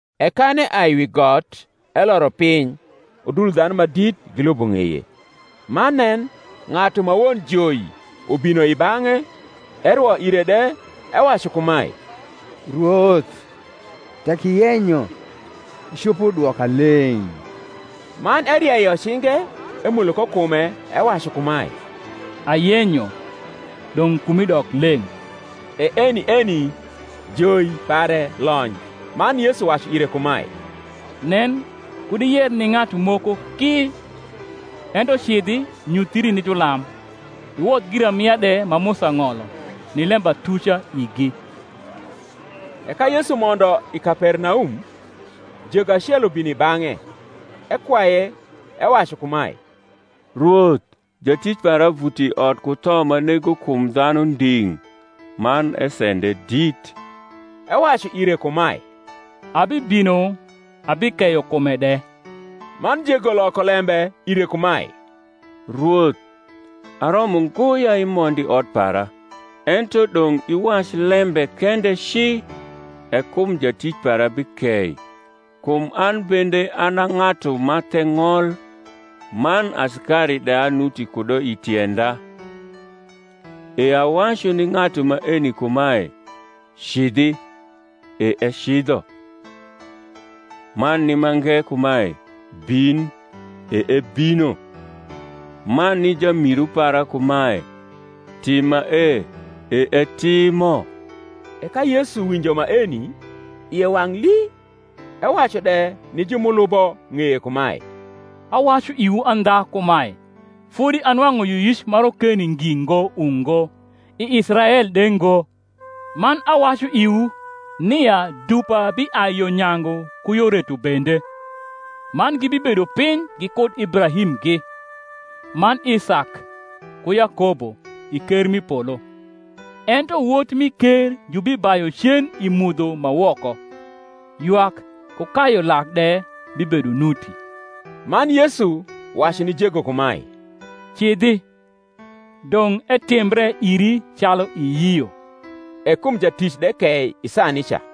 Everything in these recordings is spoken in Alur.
E kan eai wi got eloro piny, udul dhanu ma dit gilubo ng’eye. Man nen, ng’atu ma won joi ubino i bang’e, erwo ire de, ewacu kumae, Rwoth, tek iyenyo, icopo dwoka leng’. Man erieyo cinge, emulo ko kume, ewacu kumae, Ayenyo; dong’ kumi dok leng’. E eni eni joi pare lony. Man Yesu wacu ire kumae, Nen kud iyer ni ng’atu moko ki; ento cidhi, nyuthri ni julam, iwodh giramia de ma Musa ng’olo, ni lembatuca igi. E ka Yesu mondo i Kapernaum, jego acel ubino i bang’e, ekwaye, ewacu kumae, Rwoth, jatic para vuto i ot ku tho ma nego kum dhanu nding’, man esende dit. Ewacu ire kumae, Abibino abikeyo kume de. Man jego loko lembe ire kumae, Rwoth, aromo ngo ya imond i ot para; ento dong’ iwac lembe kende ci, e kum jatic para bikei. Kum an bende an a ng’atu ma the ng’ol, man asikari de anuti kudo i tienda: e awacu ni ng’atu maeni kumae, Cidhi, e ecidho; man ni mange kumae, Bin, e ebino; man ni jamiru para kumae, Tim mae, e etimo. E ka Yesu winjo maeni, ie wang’ lii, ewacu de ni ju m’ulubo ng’eye kumae, Awacu iwu andha kumae, Fodi anwang’u yioyic ma rokeni ngi ngo, ungo, i Israel de ngo. Man awacu iwu, nia dupa biai yo nyangu ku yo reto bende, man gibibedo piny gikud Ibrahimgi, man Isak, ku Yakobo, i ker m’i polo: ento wot mi ker jubibayu cen i mudho ma woko: ywak ku kayu lak de bibedo nuti. Man Yesu wacu ni jego kumae, Cidhi; dong’ etimbre iri, calu iyio. E kum jatic de kei i saa nica.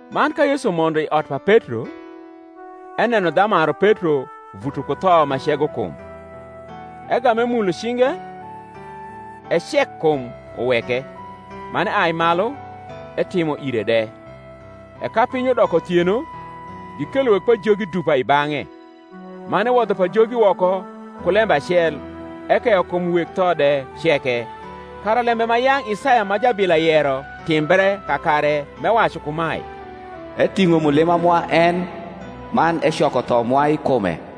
Man ka Yesu mondo i ot pa Petro, eneno dhamaru Petro vuto ku tho ma cego kum. Egam emulo cinge, e cekkum uweke; man eai malu, etimo ire de. E ka piny udoko uthieno, gikelo weg pajogi dupa i bang’e: man ewodho pajogi woko ku lembe acel, ekeyo kum weg tho de ceke: kara lembe ma yang’ Isaya ma jabila yero timbre kakare, m’ewacu kumae, Eting’o mulima mwa en, man ecoko tho mwa i kume.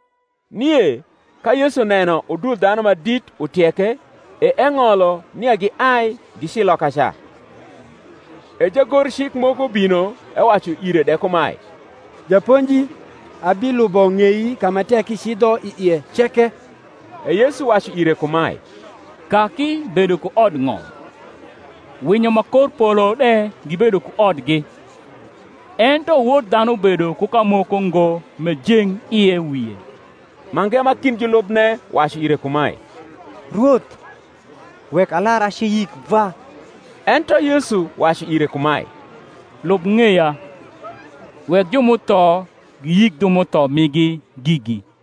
Nie ka Yesu neno udul dhanu ma dit utieke, e eng’olo nia giai gici lokaca. E jagorcik moko bino, ewacu ire de kumae, Japonji, abilubo ng’ei ka ma tek icidho i ie ceke. E Yesu wacu ire kumae, Kaki bedo ku odng’om, winyo ma kor polo de gibedo ku odgi; ento Wod dhanu bedo ku kamoko ngo m’ejeng ie wie. Mange ma kind julubne wacu ire kumae, Rwoth, wek alar aci yik vwa. Ento Yesu wacu ire kumae, Lub ng’eya; wek ju m’utho giyik ju m’utho migi gigi.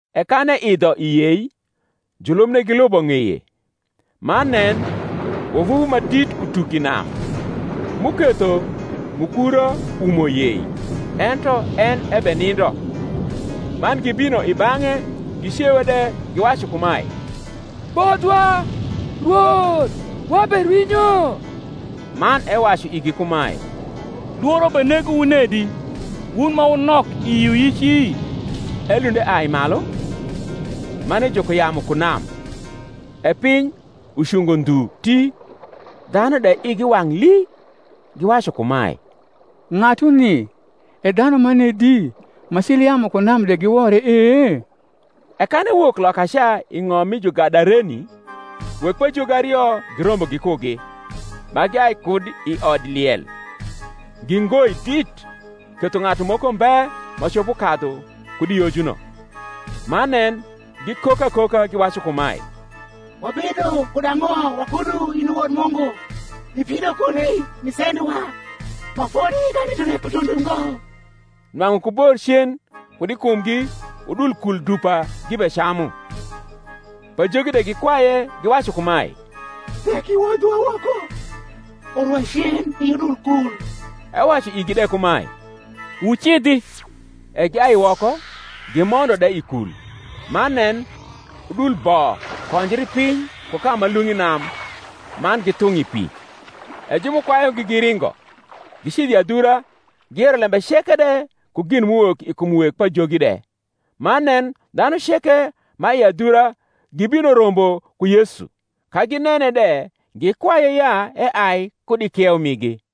E kan eidho i yei, julubne gilubo ng’eye. Man nen, wavuvu ma dit utuk i nam, m’uketho mukura umo yei: ento en ebenindo. Man gibino i bang’e, gicewe de, giwacu kumae, Bodhwa, Rwoth; waberwinyo. Man ewacu igi kumae, Lworo benegowu nedi, wun ma wunok i yioyici? Elund eai malu, man ejuko yamu ku nam; e piny ucungo ndhu ti. Dhanu de igi wang’ lii, giwacu kumae, Ng’atuni e dhanu manedi, ma cil yamu ku nam de giwore e? E kan ewok lokaca i ng’om mi Jugadareni, weg pajogi ario girombo gikugi, ma giai kud i odliel, gi ngoi dit, ketho ng’atu moko mbe ma copo kadhu kud i yojuno. Man nen, gikok akoka, giwacu kumae, Wabedo kud ang’o wakudu, in i Wod Mungu? ibino kuni nisendowa ma fodi kanindone kutundo ngo? Nwang’u ku bor cen kud i kumgi udul kul dupa gibecamu. Pajogi de gikwaye, giwacu kumae, Tek iwodhowa woko, orwa cen i udul kul. Ewacu igi de kumae, Wucidhi. E giai woko, gimondo de i kul: man nen, udul bo konjri piny ku ka ma lung’ i nam, man githung’ i pi. E ju m’ukwayugi giringo, gicidho i adhura, giyero lembe ceke de, ku gin m’uwok i kum weg pajogi de. Man nen, dhanu ceke ma i adhura gibino rombo ku Yesu: ka ginene de, gikwaye ya eai kud i kieu migi.